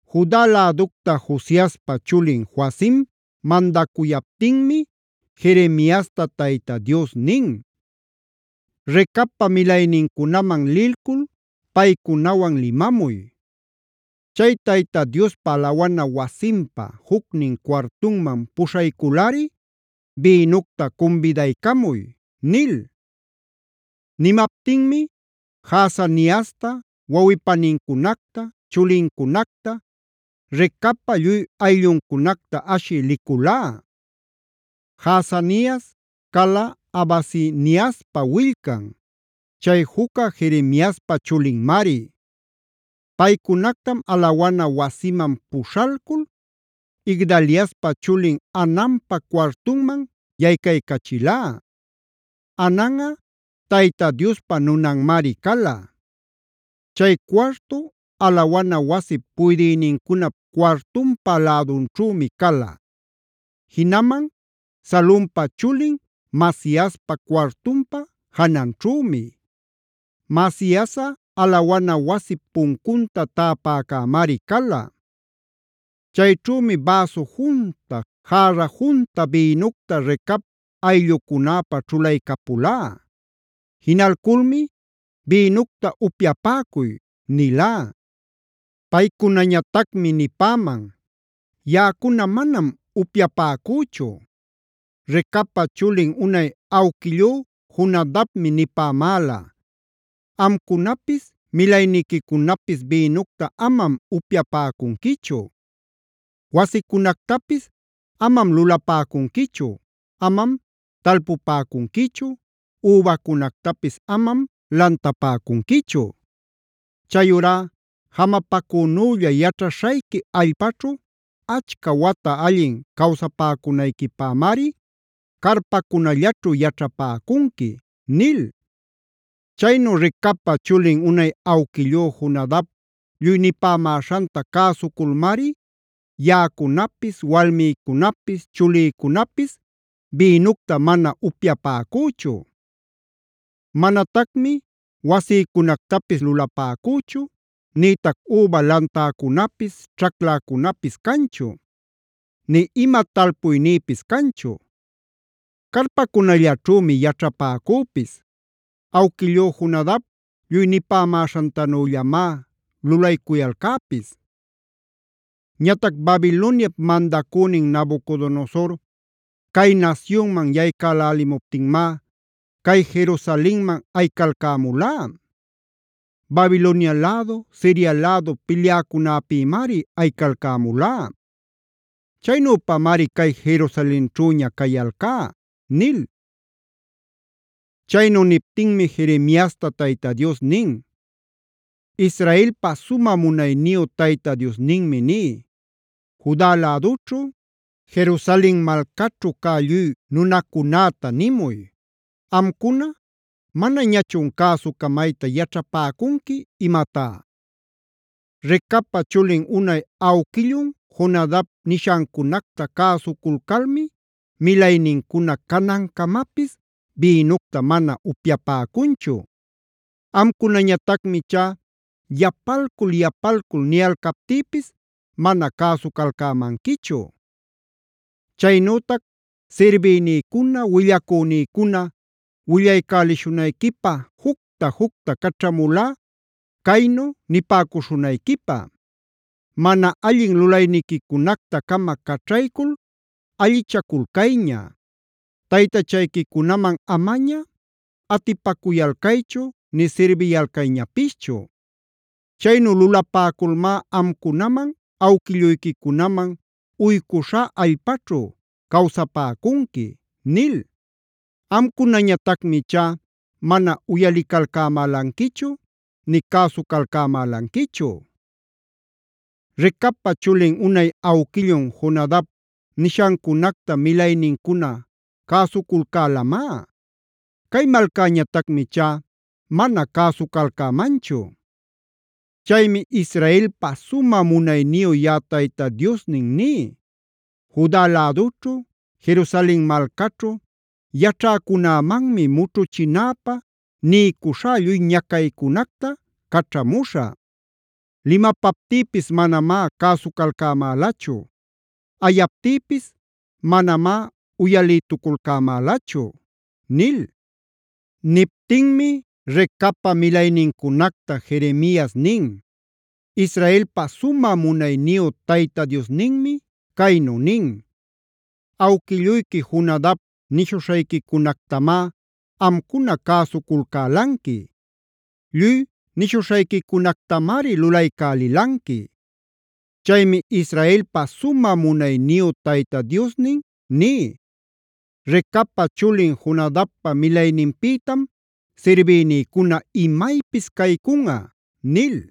Juda läducta Josiaspa chulin Joacima mandacuyaptinmi Jeremiasta Tayta Dios nin: “Recabpa milaynincunaman lilcul paycunawan limamuy. Chay Tayta Diospa alawana wasinpa jucnin cuartunman puśhayculꞌari bïnucta cumbidaycamuy” nil. Nimaptinmi Jaazaniasta, wawꞌi-panincunacta, chulincunacta, Recabpa lluy aylluncunacta ashï liculá. Jaazanias cala Habasiniaspa willcan, chay jucca Jeremiaspa chulinmari. Paycunactam alawana wasiman puśhalcul Igdaliaspa chulin Hananpa cuartunman yaycaycachilá. Hananꞌa Tayta Diospa nunanmari cala. Chay cuartu, alawana wasip puydïnincunap cuartunpa lädunćhümi cala; jinaman Salumpa chulin Maasiaspa cuartunpa jananćhümi. Maasiasꞌa alawana wasip puncunta täpäcämari cala. Chayćhümi bäsu junta, järra junta bïnucta Recab ayllucunäpa ćhulaycapulá. Jinalculmi: “Bïnucta upyapäcuy” nilá. Paycunañatacmi nipäman: “Yaꞌacuna manam upyapäcüchu. Recabpab chulin unay awquillú Jonadabmi nipämäla: ‘Amcunapis, milayniquicunapis bïnucta amam upyapäcunquichu. Wasicunactapis amam lulapäcunquichu, amam talpupäcunquichu, übäcunactapis amam lantapäcunquichu. Chayurá jamapacünülla yaćhaśhayqui allpaćhu achca wata allin cawsapäcunayquipämari carpacunallaćhu yaćhapäcunqui’ nil. Chaynu Recabpa chulin unay awquillú Jonadab lluy nipämäśhanta cäsuculmari yaꞌacunapis, walmïcunapis, chulïcunapis bïnucta mana upyapäcüchu. Manatacmi wasïcunactapis lulapäcüchu, nïtac üba lantäcunapis, ćhacläcunapis canchu; nï ima talpuynïpis canchu. Carpacunallaćhümi yaćhapäcüpis. Awquillú Jonadab lluy nipämäśhantanüllamá lulaycuyalcäpis. Ñatac Babiloniap mandacünin Nabucodonosor cay nasyunman yaycälälimuptinmá cay Jerusalenman ayicalcämulá. Babilonia lädu, Siria lädu pilyäcunäpïmari ayicalcämulá. Chaynüpamari cay Jerusalenćhüña cayalcá” nil. Chaynu niptinmi Jeremiasta Tayta Dios nin: “Israelpa sumä munayniyu Tayta Diosninmi ní: Juda lädućhu, Jerusalen malcaćhu cä lluy nunacunäta nimuy: ‘Amcuna, ¿manañachun cäsucamayta yaćhapäcunqui imatá? Recabpa chulin unay awquillun Jonadab nishancunacta cäsuculcalmi milaynincuna canancamapis bïnucta mana upyapäcunchu. Amcunañatacmi ichá yapalcul-yapalcul niyalcaptïpis mana cäsucalcämanquichu. Chaynütac sirbïnïcuna, willacünïcuna willaycälishunayquipä jucta-jucta caćhamulá caynu nipäcuśhunayquipä: “Mana allin lulayniquicunacta-cama caćhaycul allichaculcayña. Taytachayquicunaman amaña atipacuyalcaychu nï sirbiyalcayñapischu. Chaynu lulapäculmá amcunaman awquilluyquicunaman uycuśhá allpaćhu cawsapäcunqui” nil. Amcunañatacmi ichá mana uyalicalcämälanquichu, nï cäsucalcämälanquichu. Recabpa chulin unay awquillun Jonadab nishancunacta milaynincuna cäsuculcälamá. Cay malcäñatacmi ichá mana cäsucalcämanchu. Chaymi Israelpa sumä munayniyu yaꞌa Tayta Diosnin ní: Juda lädućhu, Jerusalen malcaćhu yaćhäcunämanmi mućhuchinäpä niycuśhá lluy ñacaycunacta caćhamuśhä. Limapaptïpis manamá cäsucalcämälachu; ayaptïpis manamá uyalïtucalcämälachu’” nil. Niptinmi Recabpa milaynincunacta Jeremias nin: “Israelpa sumä munayniyu Tayta Diosninmi caynu nin: ‘Awquilluyqui Jonadab nishuśhayquicunactamá amcuna cäsuculcälanqui; lluy nishuśhayquicunactamari lulaycälilanqui. Chaymi Israelpa sumä munayniyu Tayta Diosnin ní: Recabpa chulin Jonadabpa milayninpïtam sirbïnïcuna imaypis caycunꞌa’” nil.